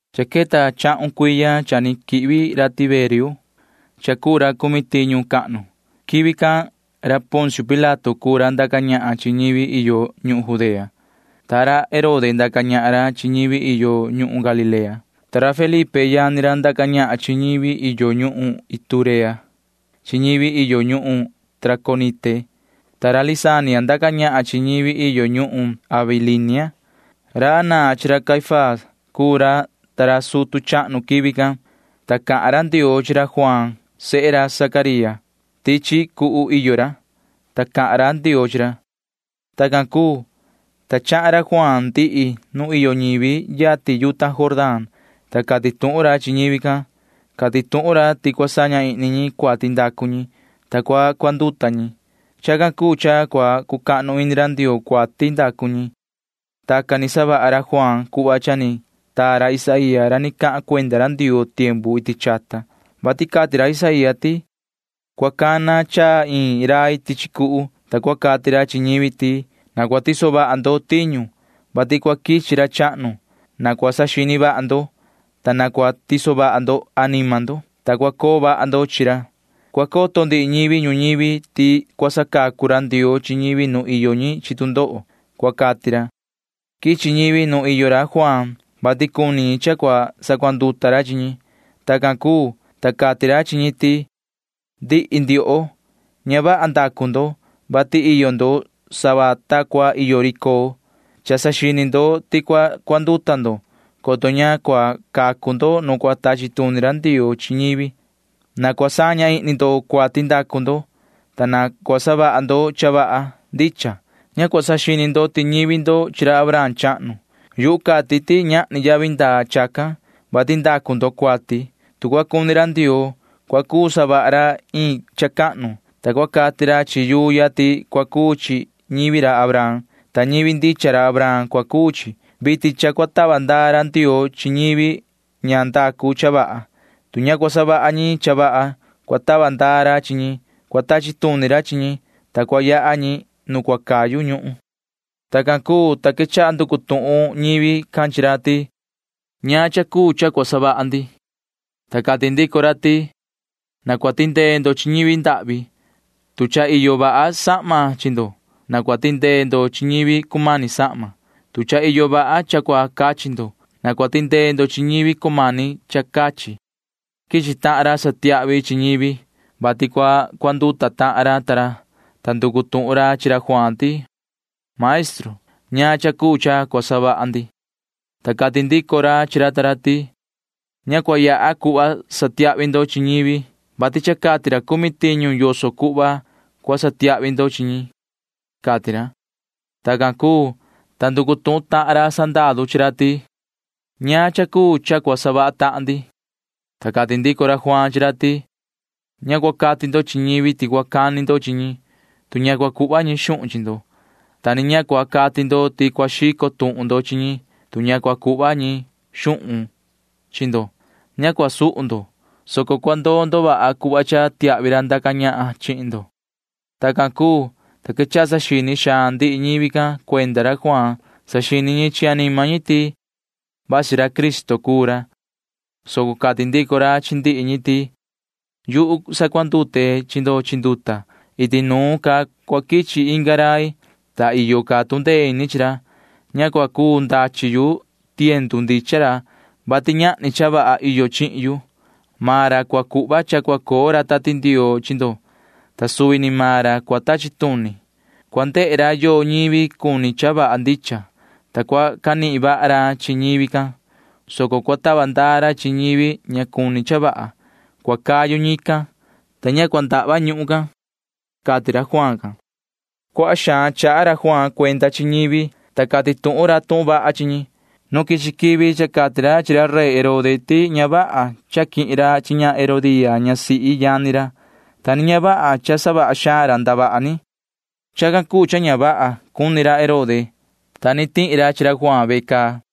Cha queta chahun cuiya cha ni quihvi ra Tiberio, ta cuu ra cumi tiñu cahnu. Quivi can Poncio Pilato cuu ra ndaca ñahan chi ñivi iyo ñuhun Judea, ta ndaca ñahan ra Herode chi ñivi iyo ñuhun Galilea, ta ndaca ñahan ra Felipe yani ra chi ñivi iyo ñuhun Iturea chi ñivi iyo ñuhun Traconite, ta ndaca ñahan ra Lisania chi ñivi iyo ñuhun Abilinia. Anaa chi ra Caifás cuu ra cuu sutu chahnu quivi can, ta cahan ra Ndioo chi ra Juaan sehe ra Zacaría. Tichi cuhu iyo ra, ta cahan ra Ndioo chi ra. Tacan cuu, ta chahan ra Juaan ndihi nu iyo ñivi yatin yuta Jordán, ta cati tuhun ra chi ñivi can. Cati tuhun ra ti na cua saña ihni ñi cuati ndacu ñi, ta cua cuanduta ñi. Chacan cuu cha cua cucahnu ini ra Ndioo cuati ndacu ñi. Tacan ni savaha ra Juaan cuhva iyo tuhun tutu ni taa ra Isaía ra ni cahan cuenda ra Ndioo iti chata, vati cati ra Isaía ti: Cua cana chaa iin rai tichi cuhu, ta cua cati ra chi ñivi ti: “Na cua tiso vaha ndo tiñu, vati cua quichi ra chahnu. Na cua saxini vaha ndo, ta na cua tiso vaha ndo anima ndo, ta cua coo vaha ndo chi ra. Cua coto ndihi ñivi ñuñivi ti cua sacacu ra Ndioo chi ñivi nu iyo ñi chi tu ndoho,” cua cati ra, cati ra Isaía. Quichi ñivi nu iyo ra Juaan, vati cuni ñi cha cua sacuanduta ra chi ñi. Tacan cuu, ta cati ra chi ñi ti: ―Ndihi ndioho, ña vaha ñivi cuu ndo, vati iyo ndo sava ta cua iyo ri coo, [vati ña vaha ndacu ndo]. Cha saxini ndo ti cua cuanduta ndo, coto ña cua cacu ndo nu cua tachi tuni ra Ndioo chi ñivi. Na cua saña ihni ndo cuati ndacu ndo, ta na cua savaha ndo cha vaha ndicha. Ña cua saxini ndo ti ñivi ndo chi ra Abraham chahnu. Yuhu cati ti ñahni yavi ndaa chacan, vati ndacu ndo cuati. Tu cua cuni ra Ndioo, [cua cuu savaha ra iin cha cahnu,] ta cua cati ra chi yuu ya ti cua cuu chi ñivi ra Abraham, ta ñivi ndicha ra Abraham cua cuu chi. Vitin cha cua tava ndaa ra Ndioo chi ñivi ña ndacu cha vaha. Tu ña cua savaha ñi cha vaha, cua tava ndaa ra chi ñi. Cua tachi tuni ra chi ñi, ta cua yaha ñi nu cayu ñuhun ―cati ra. Tacan cuu, ta quechaha nducu tuhun ñivi can chi ra ti: ―¿Ñaan cha cuu cha cua savaha ndi? ―cati ñi. Ta cati ndico ra ti: ―Na cua tindee ndo chi ñivi ndahvi. Tu cha iyo vaha sahma chi ndo, na cua tindee ndo chi ñivi cumani sahma. Tu cha iyo vaha cha cua cachi ndo, na cua tindee ndo chi ñivi cumani cha cachi ―cati ra. Quichi tahan ra satiahvi chi ñivi, vati cua cuanduta tahan ra ta ra, ta nducu tuhun ra chi ra Juaan ti: ―Maestru, ¿ñaan cha cuu cha cua savaha ndi? ―cati ra. Ta cati ndico ra chi ra ta ra ti: ―Ña cua yaha cuhva satiahvi ndo chi ñivi, vati cha cati ra cumi tiñu yoso cuhva cua satiahvi ndo chi ñi ―cati ra. Tacan cuu, ta nducu tuhun tahan ra sandaru chi ra ti: ―¿Ñaan cha cuu cha cua savaha maan ndi? ―cati ra. Ta cati ndico ra Juaan chi ra ti: ―Ña cua cati ndo chi ñivi ti cua cani ndo chi ñi, tu ña cua cuhva ñi xuhun chi ndo, ta ni ña cua cati ndo ti cua xico tuhun ndo chi ñi, tu ña cua cuhva ñi xuhun chi ndo. Ña cua suhu ndo, soco cua ndoo ndo vaha cuhva cha tiahvi ra ndaca ñahan chihin ndo ―cati ra. Tacan cuu, ta quechaha saxini xaan ndihi ñivi can cuenda ra Juaan. Saxini ñi chi anima ñi ti vasi ra Cristo cuu ra, soco cati ndico ra chi ndihi ñi ti: ―Yuhu sacuandute chi ndo chi nduta. Iti nuun ca cua quichi inga rai, ta iyo ca tu ndee ini chi maan ra. Ña cuu ndachi yu tiendu ndichan ra, vati ñahni cha vaha iyo chihin yu. Maan ra cua cuhva cha cua coo ra Tati Ndioo chi ndo, ta suvi ni maan ra cua tachi tuni. Cua ndehe ra yoo ñivi cuni cha vaha ndicha, ta cua canihin vaha ra chi ñivi can, soco cua tava ndaa ra chi ñivi ña cuni cha vaha. Cua cayu ñican, ta ña cua ndahva ñuhun can ―cati ra Juaan can. Cuaha xaan chaha ra Juaan cuenda chi ñivi, ta cati tuhun ra tuhun vaha chi ñi. Nu quichi quivi cha cati ra chi ra Herode rey can ti ña vaha cha quihin ra chi ña Herodía ñasihi yani ra, ta ni ña vaha ndihi ca ndavaha ni ni savaha ra. Chacan cuu cha ña vaha cuni ra Herode, ta ni tihi ra chi ra Juaan ve caa.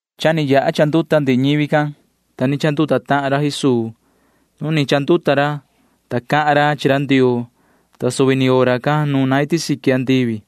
Cha ni chanduta ndihi ñivi can, ta ni chanduta tahan ra Jesuu. Nu ni chanduta ra, ta cahan ra chi ra Ndioo, ta suvi ni hora can nuna iti siqui andivi,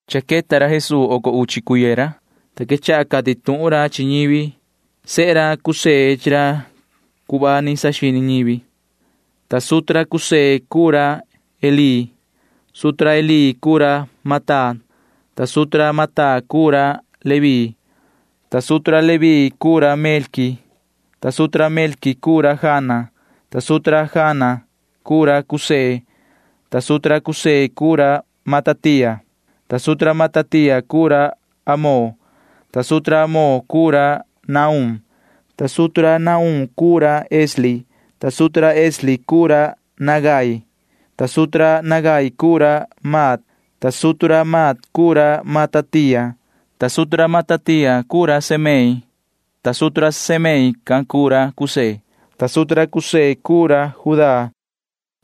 Cha queta ra Jesuu oco uchi cuiya ra, ta quechaha cati tuhun ra chi ñivi. Sehe ra José chi ra cuhva ni saxini ñivi, ta sutu ra José cuu ra Elí. Sutu ra Elí can cuu ra Matat, ta sutu ra Matat can cuu ra Leví, ta sutu ra Leví can cuu ra Melqui, ta sutu ra Melqui can cuu ra Jana, ta sutu ra Jana can cuu ra José, ta sutu ra José can cuu ra Matatía, ta sutu ra Matatía can cuu ra Amón, ta sutu ra Amón can cuu ra Nahum, ta sutu ra Nahum can cuu ra Esli, ta sutu ra Esli can cuu ra Nagai, ta sutu ra Nagai can cuu ra Maat, ta sutu ra Maat can cuu ra Matatía, ta sutu ra Matatía can cuu ra Semei, ta sutu ra Semei can cuu ra José, ta sutu ra José can cuu ra Judá,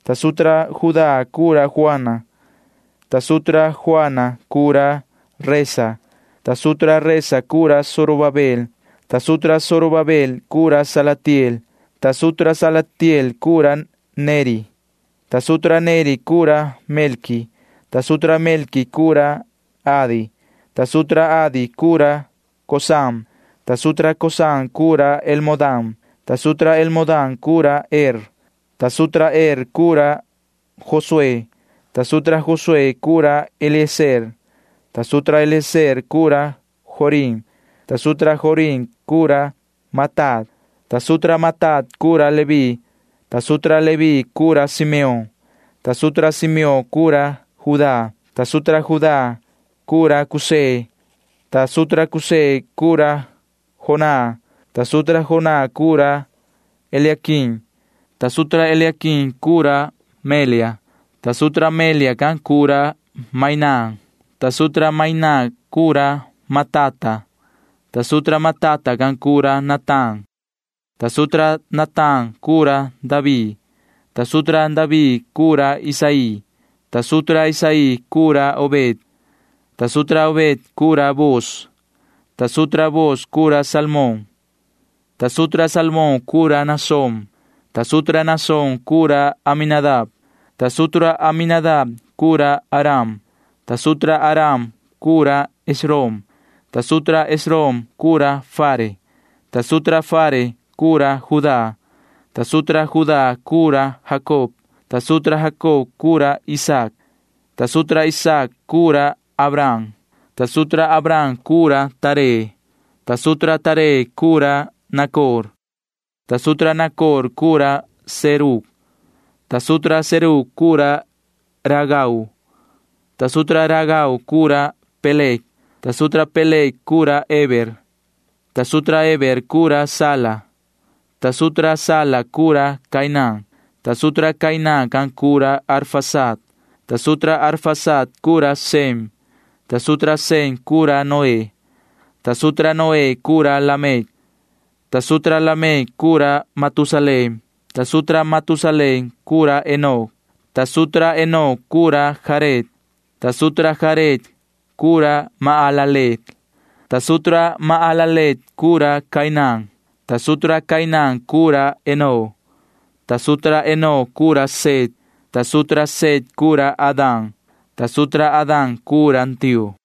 ta sutu ra Judá can cuu ra Joana, ta sutu ra Joana can cuu ra Resa, ta sutu ra Resa can cuu ra Zorobabel, ta sutu ra Zorobabel can cuu ra Salatiel, ta sutu ra Salatiel can cuu ra Neri, ta sutu ra Neri can cuu ra Melqui, ta sutu ra Melqui can cuu ra Adi, ta sutu ra Adi can cuu ra Cosam, ta sutu ra Cosam can cuu ra Elmodam, ta sutu ra Elmodam can cuu ra Er, ta sutu ra Er can cuu ra Josué, ta sutu ra Josué can cuu ra Eliezer, ta sutu ra Eliezer can cuu ra Jorim, ta sutu ra Jorim can cuu ra Matat, ta sutu ra Matat can cuu ra Leví, ta sutu ra Leví can cuu ra Simeón, ta sutu ra Simeón can cuu ra Judá, ta sutu ra Judá can cuu ra José, ta sutu ra José can cuu ra Jonán, ta sutu ra Jonán can cuu ra Eliaquim, ta sutu ra Eliaquim can cuu ra Melea, ta sutu ra Melea can cuu ra Mainán, ta sutu ra Mainán can cuu ra Matata, ta sutu ra Matata can cuu ra Natán, ta sutu ra Natán can cuu ra David, ta sutu ra David can cuu ra Isaí, ta sutu ra Isaí can cuu ra Obed, ta sutu ra Obed can cuu ra Booz, ta sutu ra Booz can cuu ra Salmón, ta sutu ra Salmón can cuu ra Naasón, ta sutu ra Naasón can cuu ra Aminadab, ta sutu ra Aminadab can cuu ra Aram, ta sutu ra Aram can cuu ra Esrom, ta sutu ra Esrom can cuu ra Fare, ta sutu ra Fare can cuu ra Judá, ta sutu ra Judá can cuu ra Jacob, ta sutu ra Jacob cuu ra Isaac, ta sutu ra Isaac cuu ra Abraham, ta sutu ra Abraham cuu ra Taré, ta sutu ra Taré cuu ra Nacor, ta sutu ra Nacor can cuu ra Serug, ta sutu ra Serug can cuu ra Ragau, ta sutu ra Ragau can cuu ra Peleg, ta sutu ra Peleg can cuu ra Heber, ta sutu ra Heber can cuu ra Sala, ta sutu ra Sala can cuu ra Cainán, ta sutu ra Cainán can cuu ra Arfaxad, ta sutu ra Arfaxad can cuu ra Sem, ta sutu ra Sem cuu ra Noé, ta sutu ra Noé cuu ra Lamec, ta sutu ra Lamec cuu ra Matusalén, ta sutu ra Matusalén cuu ra Enoc, ta sutu ra Enoc cuu ra Jared, ta sutu ra Jared can cuu ra Mahalaleel, ta sutu ra Mahalaleel can cuu ra Cainán, ta sutu ra Cainán can cuu ra Enón, ta sutu ra Enón cuu ra Set, ta sutu ra Set cuu ra Adán, ta sutu ra Adán cuu ra Ndioo.